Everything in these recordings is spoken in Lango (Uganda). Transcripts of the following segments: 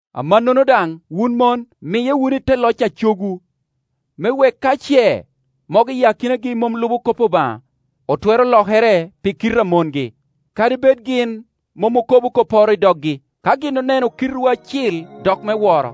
Amannono daŋ, wun mon miye wunu i te loc a cogwu, me wek ka ce mogo i akinagi mom lubo kop Obaŋa, otwero lokere pi kite a mongi, kadi bed gin mom okobo kopporo i doggi, ka gin oneno kitewu acil dok me woro.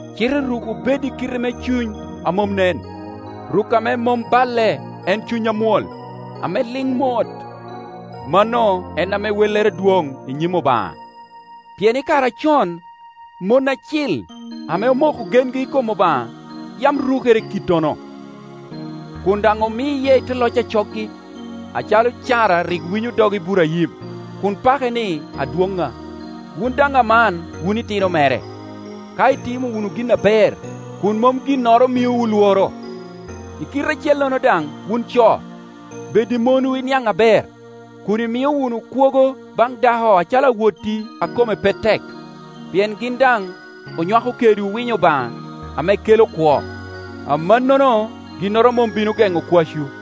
cite rukwu bed i kite me cuny a mom nen. Ruk ame mom balle en cuny amwol, ame liŋ mot; mano en ame wellere dwoŋ i nyim Obaŋa. Pien i kare acon, mon acil ame omoko gengi i kom Obaŋa yam rukere i kittono, kun daŋ omiye i te loc a coggi, acalo Cara rik winyo dog Iburaim, kun pake ni, “Adwoŋŋa.” Wun daŋ aman wun itino mere, ka itimo wunu gin aber, kun mom ginnoro miowu lworo. I kite acellono daŋ, wun co, bed i monwu i niaŋ aber, kun imio wunu kwogo baŋ dako acalo awotti a kome pe tek, pien gin daŋ onywako kedwu winyo Obaŋa ame kela kwo. Amannono ginnoro mom bino geŋo kwacwu.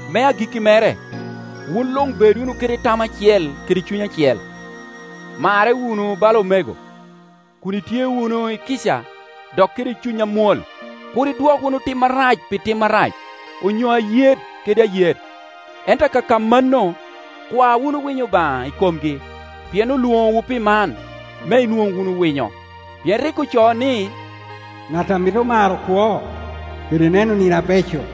Me agikki mere, wun luŋ bed wunu kede tam acel kede cuny acel. Marre wunu bala omego, kun itye wunu i kica dok kede cuny amwol. Kur idwok wunu tim arac pi tim arac, onyo ayet kede ayet; ento akaka mano, kwa wunu winyo Obaŋa i komgi, pien olwoŋowu pi man, me inwoŋ wunu winyo. Pien rik ocoo ni, “Ŋat a mito maro kwo, kede neno nino abeco,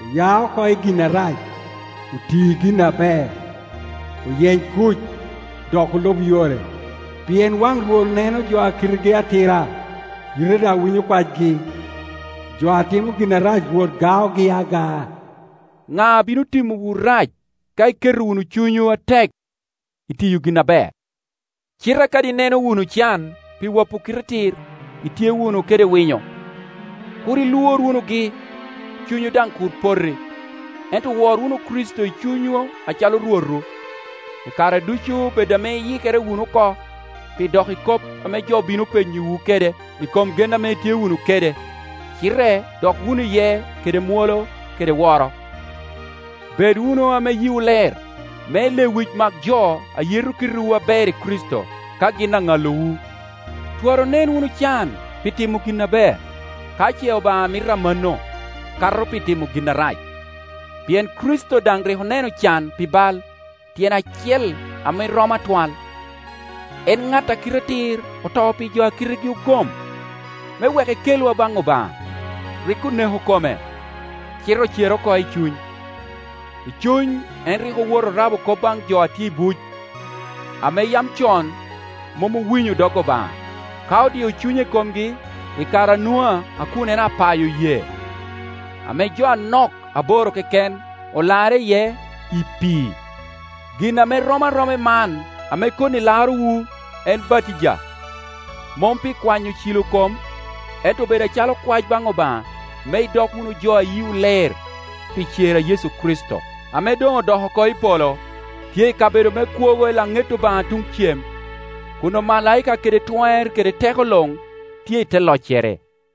Oya oko i gin arac, oti gin aber, oyeny kuc, dok olub yore, Pien waŋ Rwot neno jo a kitegi atira, yite daŋ winyo kwacgi; jo a timo gin arac Rwot gaogi agaa.” Ŋa a bino timowu rac ka iketo wunu cunywu atek i tiyo gin aber? Cite kadi ineno wunu can pi wapo kite atir, itye wunu kede winyo. Kur ilwor wunugi, cunywu daŋ kur poti, ento wor wunu Kricito i cunywu acalo Rwotwu. I kare ducu bed ame iyikere wunu oko pi dok i kop ame jo bino penyowu kede i kom gen ame itye wunu kede; cite dok wunu iye kede mwolo kede woro. Bed wunu ame yiwu ler, me lewic mak jo a yeto kitewu aber i Kricito, ka gin aŋalowu. Twara onen wunu can pi timo gin aber, ka ce Obaŋa mito amanno, kato pi timo gin arac. Pien Kricito daŋ rik oneno can pi bal, tyen acel ame romo atwal; en ŋat a kite atir oto pi jo a kitegi ogom, me wek ekelwa baŋ Obaŋa. Rik oneko kome, cite ocere oko i cuny. I cuny en rik owoto orabo kop baŋ jo a tye i buc, ame yam con mom owinyo dog Obaŋa, ka odio cunye i komgi, i kare a Nua a kun en apayo yee, ame jo anok, aboro keken, olarre iye i pii. Gin ame rom aroma i man ame koni larowu, en batija; mom pi kwanyo cilo kom, ento obedo acalo kwac baŋ Obaŋa me idok wunu jo a yiwu ler, pi cer a Yecu Kricito, ame doŋ odok oko i polo, tye i kabedo me kwogo i laŋet Obaŋa tuŋ cem, kun omalaika kede twer kede teko luŋ tye i te loccere.